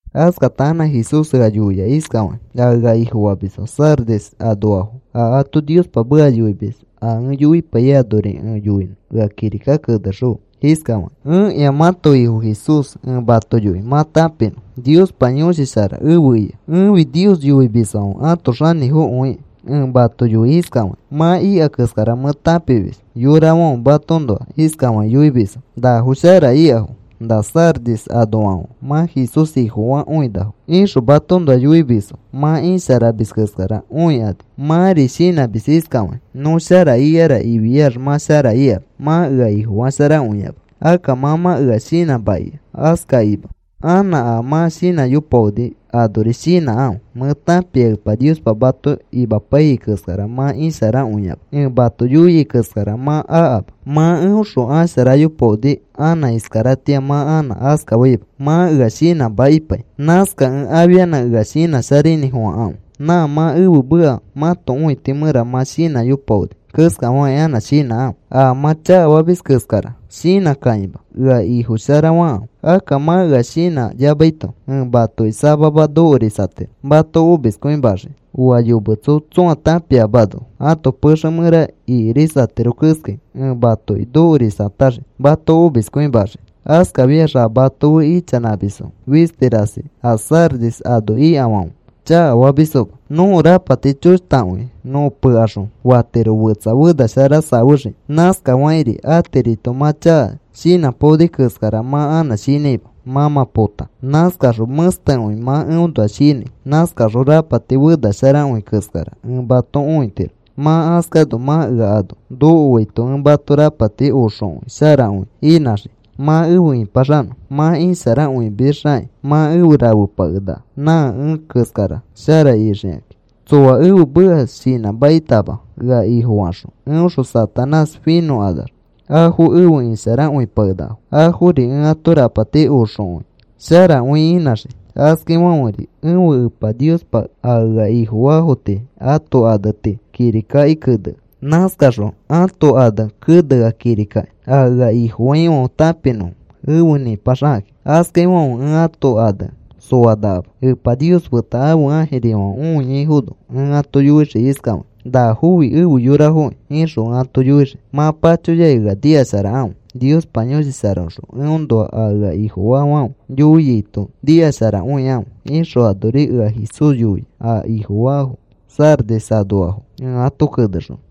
Askata anã Jesús ea yoia iskafakĩ: “A ea Ifofamisfo Sardis anoafo a ato Niospa meka yoimis a ẽ yoipaiyai anori ẽ yoinõ ea kirika kenexõfe iskafakĩ: ‘Ẽkĩa mãto Ifo Jesús ẽ mato yoi mã tãpinõ. Niospa Yõshi Shara efe ika. Ẽfi Nios yoimisfãfe ãto xanĩfokõiki. Ẽ mato yoi iskafakĩ: Mã ika keskara mẽ tãpimis. Yorafãfe matoõnoa iskafakĩ yoimisfo: “Nafo shara ikafo. Na Sardis anoafãfe mã Jesús Ifofakõinafo,” ixõ matoõnoa yoimisfo. Mã isharamis keskara õikani. Mãri shinãmis iskafakĩ: “Nõ shara ikara” ifiax mã shara ikama. Mã ea Ifofasharakõiama. Akka mã mã ea shinãmakia. Askakakĩma, anã a mã shinãyopaoni anori shinãkãfe. Mẽ tãpia Epa Niospa mato imapaiyai keskara mã isharakõiama. Ẽ mato yoiai keskara mã akama. Mã eõxõ asharayopaoni anã iskaratĩa mã anã askafaima. Mã ea shinãmakipai. Nãskakẽ afianã ea shinãsharainĩfofãkãfe. Nã mã ẽfe meka mãto õiti mẽra mã shinãyopaoni keskafakĩ anã shinãkãfe. A mã chakafamis keskara shinãkakima; ea Ifo shara fakãfe. Akka mã ea shinãyamaito ẽ matoki samama nokorisatiro mato omiskõimaxiki. Oa yometso tsõa tãpiamano ãto pexe mẽra ikirisatiro keskai, ẽ matoki nokorisataxii mato omiskõimaxiki. Askafiax a mato fe ichanãmisfo fisti rasi a Sardis ano ikafãfe chakafamisfoma. Nõko rapati choshtakõi nõ pekaxõ fatiro fetsa fena shara safexiki. Nãskafakĩri atirito mã chaka shinãpaoni keskara mã anã shinãima, mã mã pota. Nãskaxõ mẽstekõi mã eõnoa shinãi. Nãskaxõ rapati fenasharakõi keskara ẽ mato õitiro. Mã askano, mã ea ano nokoaito ẽ mato rapati oxokõi sharakõi inãxii mã efe ĩpaxanõ. Mã isharakõimisxakĩ mã efe rafepakenaka. Nã ẽ keskara shara ixikãki. Tsoa ẽfe meka shinãmakitama ea Ifofakaxõ, eõxõ Satanás finõkanax afo efe isharakõipakenakafo. Afori ẽ ato rapati oxokõi sharakõi inãxii. Askaifãferi ẽfe Epa Niospa a ea Ifofaafo tii ãto ane tii kirikaki kenea. Nãskaxõ ãto ane kenea kirikaki a ea Ifofaifãfe tãpinõfo efe nĩpaxakãki. Askaifãfe ẽ ãto ane soanakama. Epa Nios feta ãfe ãjirifãfe õiaifono ẽ ato yoixii iskafakĩ: “Nafofi efe yorafokĩ,” ixõ ẽ ato yoixii. Mã pachoyakĩ ea nikasharakãfe. Niospa Yõshi Sharaõxõ eõnoa a ea Ifofaafãfe yoiaito nikasharakõikãfe,’” ixõ anori ea Jesús yoia a Ifofaafo Sardis anoafo ẽ ato kenexonõ.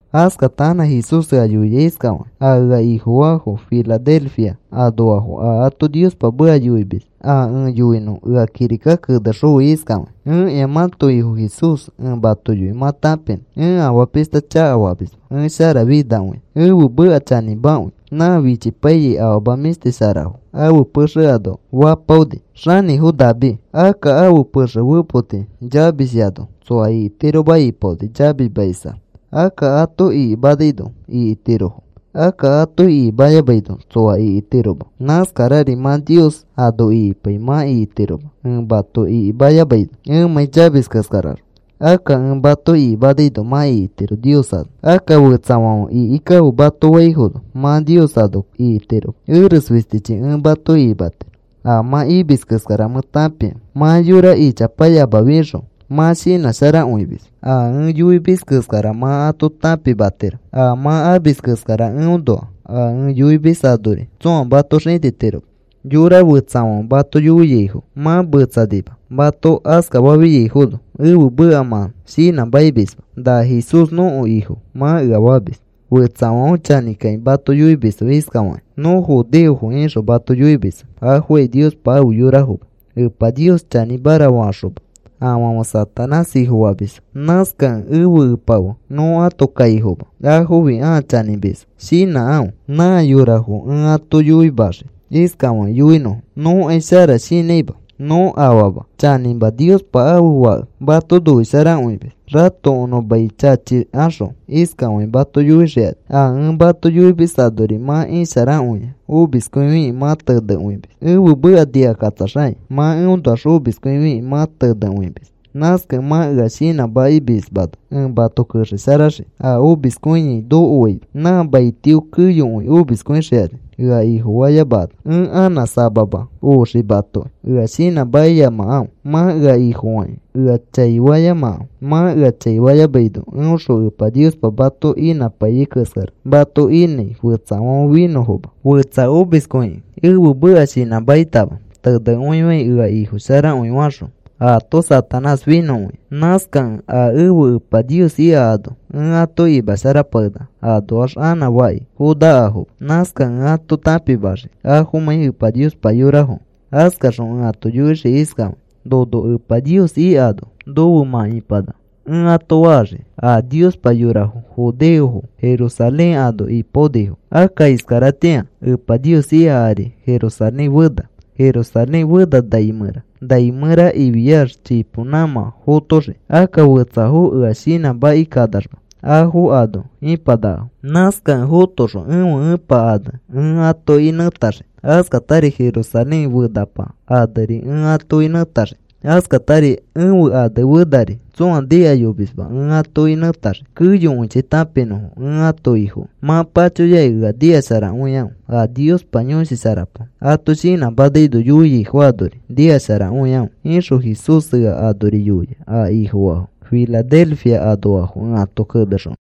Askata anã Jesús ea yoia iskafakĩ: “A ea Ifofaafo Filadelfia anoafo a ato Niospa meka yoimis a ẽ yoinõ ea kirika kenexõfe iskafakĩ: ‘Ẽkĩa mãto Ifo Jesús ẽ mato yoi mã tãpinõ. Ẽ afaa pishta chakafamisma. Ẽ sharafinakõia. Ẽfe meka chanĩmakõi. Nã fichipaiyai afama mĩshti sharafo ãfe pexe ano fapaoni, xanĩfo David. Akka ãfe pexe fepoti chamisyano tsoa ikitiroma ipaoni, chamismaisax. Akka ato ikimanaino ikitirofo. Akka ato ikimayamaino tsoa ikitiroma. Nãskarari mã Nios ano ikipai mã ikitiroma ẽ mato ikimayamaino ẽmãi chamis keskaraxõ. Akka ẽ mato ikimanaino mã ikitiro Nios ano. Akka fetsafãfe ikikãfe mato faifono mã Nios ano ikitiroma. Eres fistichi ẽ mato ikimatiro. A mã imis keskara mẽ tãpia. Mã yora ichapayamafiaxõ mã shinãsharakõimis. A ẽ yoimis keskara mã ato tãpimatiro a mã amis keskara eõnoa. A ẽ yoimis anori tsõa mato xĩtitiroma. Yora fetsafãfe mato yoiaifo mã metsanima. Mato askafafiaifono ẽfe meka mã shinãmakimisma. “Na Jesús nõko Ifo,” mã ea famis. Fetsafãfe chanĩkakĩ mato yoimisfo iskafakĩ: “Nõ judeofo,” ixõ mato yoimisfo. Afokai Niospa afe yorafoma, Epa Nios chanĩmara faxoma. Afãfe Satanás ifofamisfo. Nãskakẽ ẽfe Epa fe nõ ãto kaifoma. Afofi ãa chanĩmisfo. Shinãkãfe. Nã yorafo ẽ ato yoimaxii iskafakĩ yoinõfo: “Nõkai shara shinãima. Nõ afama. Chanĩma, Niospa ãfe Fake mato noisharakõimis,” ratokonõ mai chachikaxõ iskafakĩ mato yoixikani. A ẽ mato yoimis anori mã isharakõia omiskõifikĩ mã tenekõimis ẽfe meka nikakatsaxakĩ. Mã eõnoax omiskõifikĩ mã tenekõimis. Nãskakẽ mã ea shinãmakimismano ẽ mato kexesharaxii a omiskõiai nokoaino nã maitio. Keyokõi omiskõixikani ea Ifofayamakanax. Ẽ anã samama oxii matoki. Ea shinãmakiyamakãfe. Mã ea Ifofakĩ ea chaifayamakãfe. Mã ea chaifayamaino eõxõ Epa Niospa mato inãpaiyai keskara mato inãi fetsafãfe finõfoma. Fetsa omiskõikĩ ẽfe meka shinãmakitama tenekõifai ea Ifo sharakõi faxõ ato Satanás finõkõia. Nãskakẽ a ẽfe Epa Nios ika ano, ẽ ato imasharapakenaka. Anoax anã faki fonakafoma. Nãskakẽ ẽ afo tãpimaxii afomãi Epa Niospa yorafokẽ. Askaxõ ẽ ato yoixii iskafakĩ: “Nono Epa Nios ikano, nofe mã ipanaka,” ẽ ato faxii. A Niospa yorafo, judeofo, Jerusalén ano ipaonifo. Akka iskaratĩa Epa Nios ika ari Jerusalén fena. Jerusalén fena nai mẽra. Nai mẽra ifiax, chipo nãmã fotoxii. Akka fetsafo ea shinãmakikanaxma afo ano ipanakafo. Nãskakẽ fotoxõ ẽfe Epa ane ẽ atoki nẽtaxii. Askatari Jerusalén fenapa aneri ẽ atoki nẽtaxii. Askatari ẽfe ane fenari tsõa nikayomisma ẽ atoki nẽtaxii keyokõichi tãpinõfo ẽ ãto Ifokẽ. Mã pachoyakĩ ea nikasharakõikãfe. A Niospa Yõshi Sharapa ato shinãmanaino yoiaifo anori nikasharakõikãfe,’” ixõ Jesús ea anori yoia a Ifofaafo Filadelfia anoafo ẽ ato kenexonõ.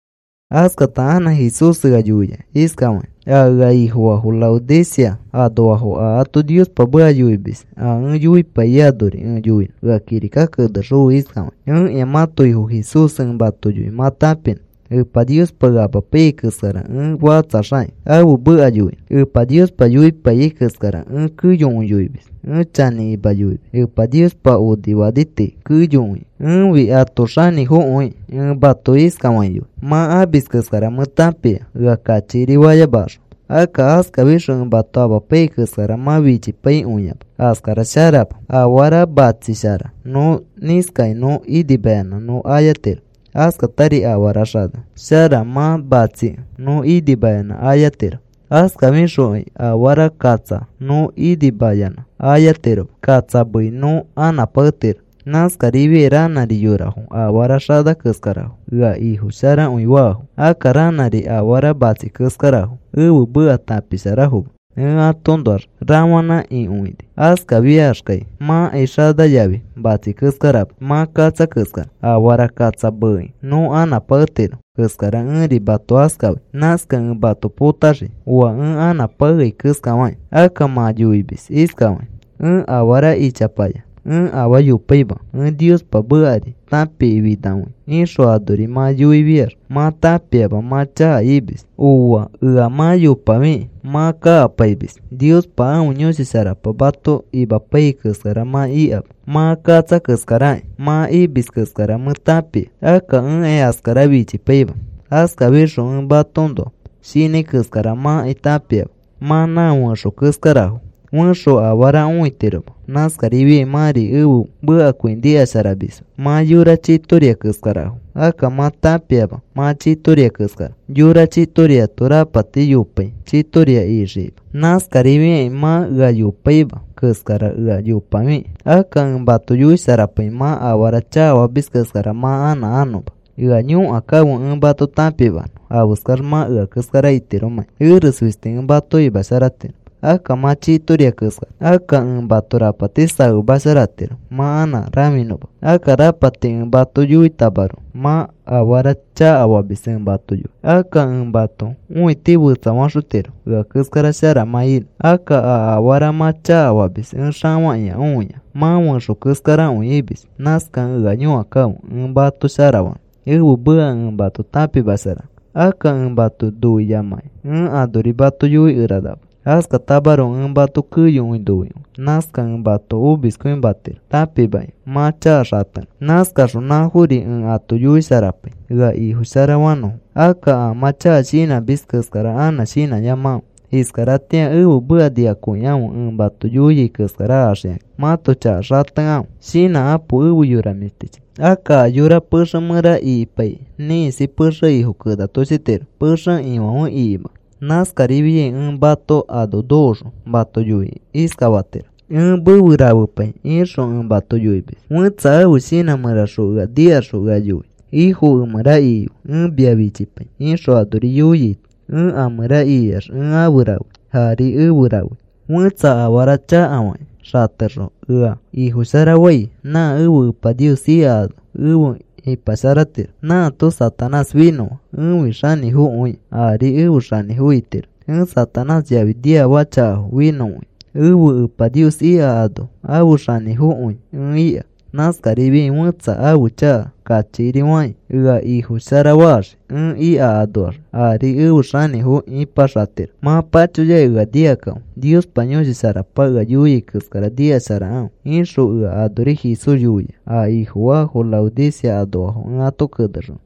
Askata anã Jesús ea yoia iskafakĩ: “A ea Ifofaafo Laodicea anoafo a ato Niospa meka yoimis a ẽ yoipaiyai anori ẽ yoinõ ea kirika kenexõfe iskafakĩ: ‘Ẽkĩa mãto Ifo Jesús ẽ mato yoi mã tãpinõ. Epa Niospa ea amapaiyai keskara ẽ fakatsaxakĩ ãfe meka yoinõ. Epa Niospa yoipaiyai keskara ẽ keyokõi yoimis. Ẽ chanĩkima yoimis. Epa Niospa onifani tii keyokõi ẽfi ãto xanĩfokõikĩ. Ẽ mato iskafakĩ yoi: Mã amis keskara mẽ tãpia. Ea kachikiri fayamakaxõ akka askafixõ ẽ mato amapaiyai keskara mã fichipaikõiama. Askara sharama. Afara matsishara nõ nĩskakĩ nõ inimayanã nõ ayatiro. Askatari afara xana shara mã matsikẽ nõ inimayanã ayatiro. Askafixokai afara katsa nõ inimayanã ayatiroma. Katsa meei nõ anãpaketiro. Nãskarifiai ranãri yorafo afara xana keskarafo. Ea Ifo sharakõi faafo. Akka ranãri afara matsi keskarafo. Ẽfe meka tãpisharafoma. Ẽ atoõnoax rafanã ikõini. Askafiaxkai mãkai xana yafi matsi keskarama. Mã katsa keskara. Afara katsa meekĩ nõ anãpaketiro keskara ẽri mato askafai. Nãskakẽ ẽ mato potaxii oa ẽ anãpakeai keskafakĩ. Akka mã yoimis iskafakĩ: “Ẽ afara ichapaya. Ẽ afaa yopaima. Ẽ Niospa mekari tãpifinakõia,” ixõ, anori mã yoifiax mã tãpiama mã chaka imis. Ooa. Ea mã yopafikĩ mã kakapaimis. Niospa ãfe Yõshi Sharapa mato imapaiyai keskara mã ikama. Mã katsa keskarakĩ. Mã imis keskara mẽ tãpia. Akka ẽkai askara fichipaima. Askafixõ ẽ matoõnoa shinãi keskara mãkai tãpiama. Mã nã fẽxo keskarafo. Fẽxo afara õitiroma. Nãskarifiai mãri ẽfe mekakõi nikasharamisma. Mã yora chitoria keskarafo. Akka mã tãpiama mã chitoria keskara. Yora chitoriato rapati yopai chitoria ixikima. Nãskarifiakĩ mã ea yopaima keskara ea yopafikĩ. Akka ẽ mato yoisharapai mã afara chakafamis keskara mã anã anõma. Ea yõkakãfe ẽ mato tãpimanõ afeskax mã ea keskara itiromãkĩ. Eres fisti ẽ mato imasharatiro. Akka mã chitoria keskara. Akka ẽ mato rapati safemasharatiro mã anã rãfinõma. Akka rapati ẽ mato yoitamaroko mã afara chakafamis ẽ mato yoi. Akka ẽ mãto õiti fetsafaxotiro ea keskara shara mã inõ. Akka a afara mã chakafamis ẽ xafakĩa õia. Mã fẽxo keskarakõi imis. Nãskakẽ ea yõkakãfe ẽ mato sharafanõ, ẽfe meka ẽ mato tãpimasharanõ. Akka ẽ mato noiyamakĩ ẽ anori mato yoikeranama. Askatamaroko ẽ mato keyokõi noikõi. Nãskakẽ ẽ mato omiskõimatiro tãpimakĩ mã chaka xatenõ. Nãskaxõ nãfori ẽ ato yoisharapai ea Ifo shara fanõfo. Akka a mã chaka shinãmis keskara anã shinãyamakãfe. Iskaratĩa ẽfe meka nikakõikãfe ẽ mato yoiai keskara axikakĩ mãto chaka xatekãfe. Shinãkapo efe yora mĩshtichi. Akka a yora pexe mẽra ikipaikĩ ĩkisi pexe ifo kenatoshitiro pexe ifãfe ikimanõ. Nãskarifiai ẽ mato ano nokoxõ mato yoikĩ iskafaxii: “Ẽ mefe rafepai,” ixõ ẽ mato yoimis. Fẽtsa ãfe shinã mẽraxõ ea nikaxõ ea yoi: “Ifo, emẽra ikife. Ẽ mia fichipai,” ixõ anori yoiaito ẽ a mẽra ikiax ẽ afe rafei. Ari efe rafei. Fẽtsa afara chakafakĩ xatexõ ea Ifosharafai nã ẽfe Epa Nios ika ano efe ipasharatiro. Nãato Satanás finõa. Ẽfi xanĩfokõikĩ ari efe xanĩfo itiro. Ẽ Satanás yafi niafaka chakafo finõkõia. Ẽfe Epa Nios ika ano afe xanĩfokõi ẽ ika. Nãskarifiai fẽtsa ãfe chaka kachikiri fakĩ, ea Ifosharafaxii ẽ ika anoax ari efe xanĩfo ipaxatiro. Mã pachoyakĩ ea nikakãfe. Niospa Yõshi Sharapa ea yoiai keskara nikasharakãfe,’” ixõ ea anori Jesús yoia a Ifofaafo Laodicea anoafo ẽ ato kenexonõ.